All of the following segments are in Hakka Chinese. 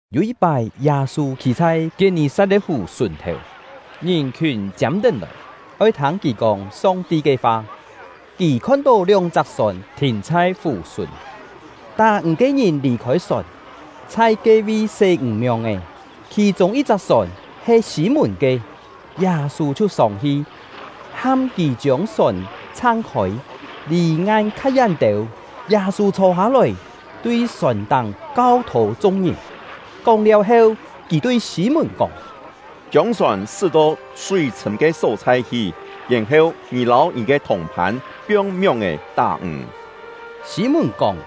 Yû yit-pái, Yâ-sû khî chhai Kiet-nì-sat-le̍t-fù sùn-thèu, ngìn-khiùn chiâm-tén lòi, oi thâng kì kóng Song-ti ke fa. Kì khon-tó lióng-chak sòn thìn chhai fù-sùn, tá-ǹg ke ngìn lì-khôi sòn, chhai ke-vi sé ǹg mióng-è. Khì-chûng yit-chak sòn he Sî-mùn ke; Yâ-sû chhiu sông-hi, ham kì chiông sòn chhang-khôi, lì ngan kha yén têu. Yâ-sû chhô-hâ-lòi, tui sòn-táng kau-thô chung-ngìn. Kóng-liáu heu, kì tui Sî-mùn kóng: “Chiông sòn sṳ́-to súi-chhṳ̂m ke só-chhai hi, yèn-heu ngì lâu ngì ke thùng-phân piong mióng-è tá-ǹg.” Sî-mùn kóng: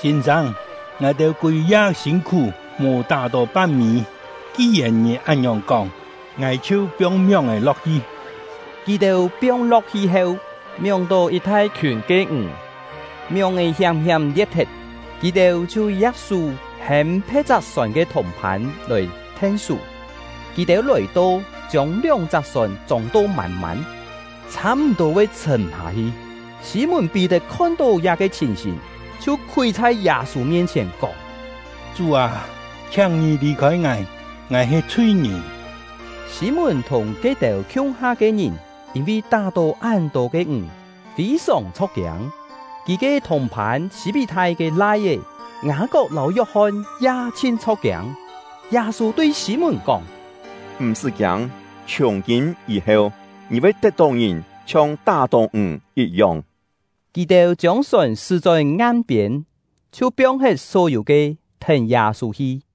“Sîn-sâng, ngài-têu kûi-ya sîn-khú, mò tá-tó pan-mî; ki-yèn ngì án-ngiòng kóng, ngài chhiu piong mióng-è lo̍k-hi!” Kì-têu piong-lo̍k-hi heu, mióng-tó yit thai-khiùn ke ǹg, mióng-è hiám-hiám lie̍t-thet. Kì-têu chhiu ya̍k-sú hêm phe̍t-chak sòn ke thùng-phân lòi then-sú. Kì-têu lòi-to, chiông lióng-chak sòn chông-to mân-mân, chhâ-m̀-tô voi chhṳ̀m-hâ-hi. Sî-mùn-Pí-tet khon-tó liá-ke chhìn-hìn, chhiu khúi chhai Yâ-sû mien-chhièn, kóng: “Chú â, chhiáng ngì lì-khôi ngài, ngài he chhui-ngìn!” Sî-mùn thùng ke-têu khiung-ha ke ngìn, yîn-vi tá-tó án-tô ke ǹg, fî-sòng chho̍k-kiâng. Kì ke thùng-phân Sî-pí-thai ke lai-é Ngâ-kok lâu Yok-hon ya chhin chho̍k-kiâng. Yâ-sû tui Sî-mùn kóng: “M̀-sṳ́ kiâng, chhiùng-kîm yî-heu, ngì voi tet-tó ngìn chhiong tá-tó ǹg yit-yong.” Kì-têu chiông sòn sṳ́-chón ngan-piên, chhiu piong-thet só-yû ke, thèn Yâ-sû hi.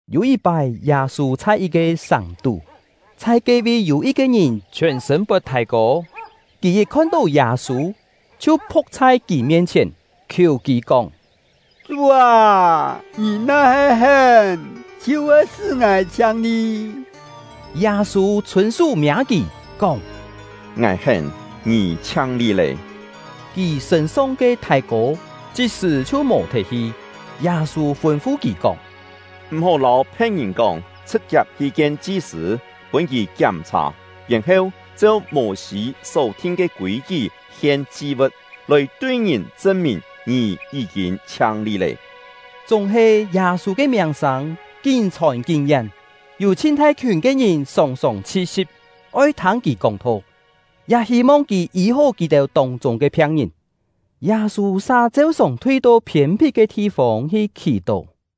Yû yit-pái, Yâ-sû chhai yit-ke sàng-tú, chhai ke-vi yû yit-ke ngìn chhiòn-sṳ̂n pot thái-kô. Kì yit khon-tó Yâ-sû, chhiu phu̍k chhai kì mien-chhièn, khiù kì kóng: “Chú â, ngì na-he hén, chhiu voi sṳ́ ngài chhiang-li.” Yâ-sû chhûn-sú miâ kì, kóng: “Ngài hén, ngì chhiang-li lé!” Kì sṳ̂n-song ke thái-kô chit-sṳ̀ chhiu mò-thet hi. Yâ-sû fûn-fu kì kóng: “M̀-hó lâu phe̍t-ngìn kóng; chhṳ̍t-chiap hi kien chi-sṳ̂, pûn kì kiám-chhà, yèn-heu cheu Mô-sî só-thin ke kûi-kí hien chi-vu̍t, lòi tui ngìn chṳn-mìn ngì yí-kîn chhiang-li lé.” Chúng-he, Yâ-sû ke miàng-sâng kín chhòn kín yén. Yû chhin thai-khiùn ke ngìn sòng-sòng chhi-si̍p, oi thâng kì kóng-tho, ya hî-mong kì yî-hó kì-têu tông-chûng ke phiang-ngìn. Yâ-sû sa cheu-sòng thui-to phiên-phit ke thi-fông hi khì-tó.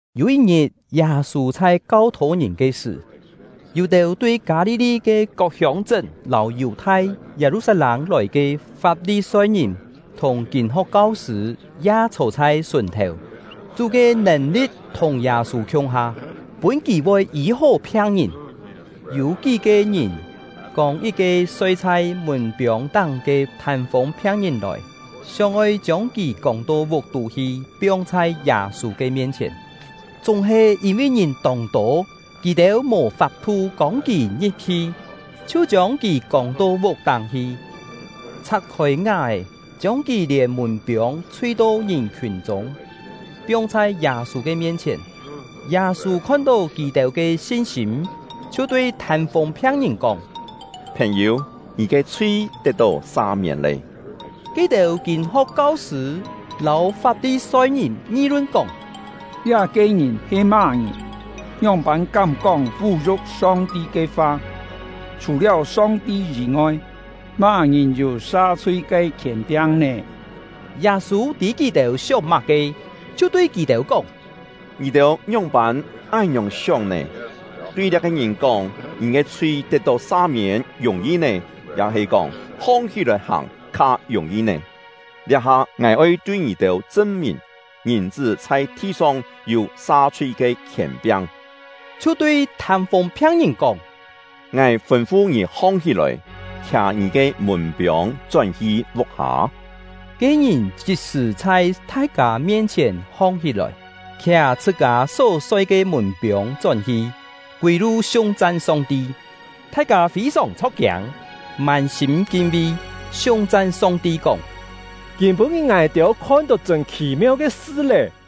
Yû yit-ngit, Yâ-sû chhai kau-thô ngìn ke sṳ̀, yû-têu tui Kâ-li-li ke kok hiông-chṳ́n lâu Yù-thai, Yâ-lu-sat-lâng lòi ke Fap-li-soi-ngìn thùng kîn-ho̍k kau-sṳ̂ ya chhô chhai sùn-thèu. Chú ke nèn-li̍t thùng Yâ-sû khiung-ha, pûn kì voi yî-hó phiang-ngìn. Yû kí-ke ngìn, kông yit-ke soi chhai mùn-piông-táng ke thân-fûng phiang-ngìn lòi, sióng-oi chiông kì kông to vuk-tú hi, piong chhai Yâ-sû ke mien-chhièn. Chúng-he, yîn-vi ngìn tông tô, kì-têu mò fap-thu kông kì ngi̍p-hi, chhiu chiông kì kông to vuk-táng hi, chhak-khôi ngá-è, chiông kì lièn mùn-piông chhui-to ngìn-khiùn chûng, piong chhai Yâ-sû ke mien-chhièn. Yâ-sû khon-tó kì-têu ke sin-sîm, chhiu tui thân-fûng phiang-ngìn kóng: “Phèn-yû, ngì ke chhui tet-tó sa-miên lé.” Ke-têu kîn-ho̍k kau-sṳ̂ lâu Fap-li-soi-ngìn ngi-lun kóng: “Liá-ke ngìn he má-ngìn? Ngióng-pân kám-kóng vú-yu̍k Song-ti ke fa! Chhù-liáu Song-ti yî-ngoi, má-ngìn yû sa-chhui ke khièn-piang nè?” Yâ-sû tî kì-têu sióng má-ke, chhiu tui kì-têu kóng: “Ngì-têu ngióng-pân án-ngiòng sióng nè? Tui liá-ke ngìn kóng: ‘Ngì ke chhui tet-tó sa-miên’ yùng-yi nè? Ya-he kóng: ‘Hong-hí-lòi hàng’ kha yùng-yi nè? Liá-ha ngài oi tui ngì-têu chṳn-mìn, Ngìn-chṳ́ chhai thi-song yû sa-chhui ke khièn-piang.” Chhiu tui thân-fûng phiang-ngìn kóng: “Ngài fûn-fu ngì hong-hí-lòi, khià ngì ke mùn-piông chón-hi vuk-hâ!” Ke-ngìn chit-sṳ̀ chhai thai-kâ mien-chhièn hong-hí-lòi, khià chhṳ-kâ só soi ke mùn-piông chón-hi, kûi-lu siung-chan Song-ti. Thai-kâ fî-sòng chho̍k-kiâng, mân-sîm kin-vi, siung-chan Song-ti kóng: “Kîm-pû-ngit ngài-têu khon-tó chṳ̂n khì-meu ke sṳ lé!”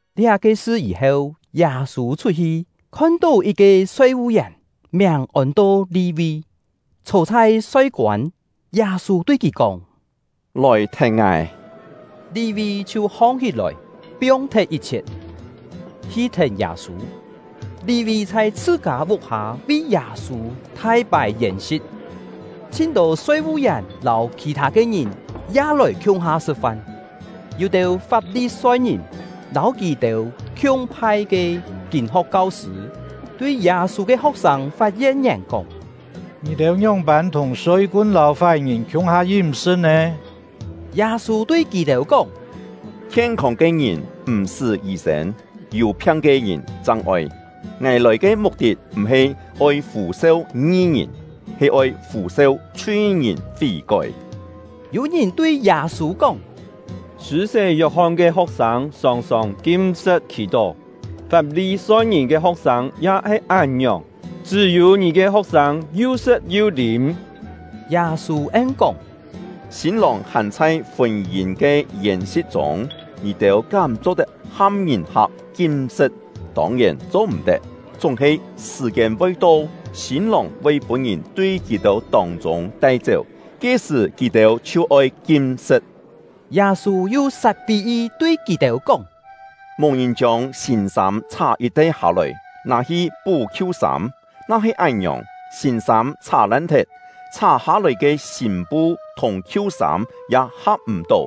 Liá-ke sṳ yî-heu, Yâ-sû chhut-hi, khon-tó yit-ke soi-vu-yèn, miàng ôn-to Li-vi, chhô chhai soi-koân. Yâ-sû tui kì kóng: “Lòi thèn ngài!” Li-vi chhiu hong-hí-lòi, piong-thet yit-chhiet, hi thèn Yâ-sû. Li-vi chhai chhṳ-kâ vuk-hâ vi Yâ-sû thai pài yèn-si̍t; chhin-tô soi-vu-yèn lâu khì-thâ ke ngìn ya lòi khiung-ha sṳ̍t-fan. Yû-têu Fap-li-soi-ngìn lâu kì-têu khiung-phai ke kîn-ho̍k kau-sṳ̂ tui Yâ-sû ke ho̍k-sâng fat yen-ngièn kóng: “Ngì-têu ngióng-pân thùng soi-kun lâu fái-ngìn khiung-ha yím-sṳ̍t nè?” Yâ-sû tui kì-têu kóng: “Khien-không ke ngìn m̀-sṳ́ yî-sên, yû phiang ke ngìn chang oi. Ngài lòi ke muk-tit m̀-he oi fû-seu ngi-ngìn, he oi fû-seu chhui-ngìn fí-kói.” Yû ngìn tui Yâ-sû kóng: “Sṳ̂-sé Yok-hon ke ho̍k-sâng sòng-sòng kim-sṳ̍t khì-tó, Fap-li-soi-ngìn ke ho̍k-sâng ya he án-ngiòng, chṳ́-yû ngì ke ho̍k-sâng yu sṳ̍t yu lîm.” Yâ-sû en-kóng: “Sîn-lòng hàn chhai fûn-yîn ke yèn-si̍t chûng, ngì-têu kám cho-tet ham ngìn-hak kim-sṳ̍t? Tông-yèn cho-m̀-tet! Chúng-he sṳ̀-kiên voi to, sîn-lòng voi pûn-ngìn tui kì-têu tông-chûng tai-chéu, ke-sṳ̀ kì-têu chhiu oi kim-sṳ̍t.” Yâ-sû yu sat pí-yi tui kì-têu kóng: “Mò ngìn chiông sîn-sâm chhá yit-te hâ-lòi, nâ-hi pú khiu-sâm; na-he án-ngiòng, sîn-sâm chhá-lan-thet, chhá-hâ-lòi ke sîn-pu thùng khiu-sâm ya ha̍p-m̀-tó.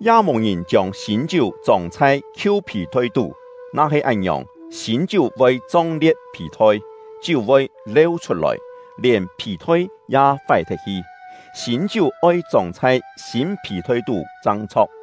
Ya mò ngìn chiông sîn-chiú chông chhai khiu phì-thoi tú; na-he án-ngiòng, sîn-chiú voi chong-lie̍t phì-thoi, chiú voi leu chhut-lòi, lièn phì-thoi ya fái-thet hi. Sîn-chiú oi chông chhai sîn phì-thoi tú chang chho̍k.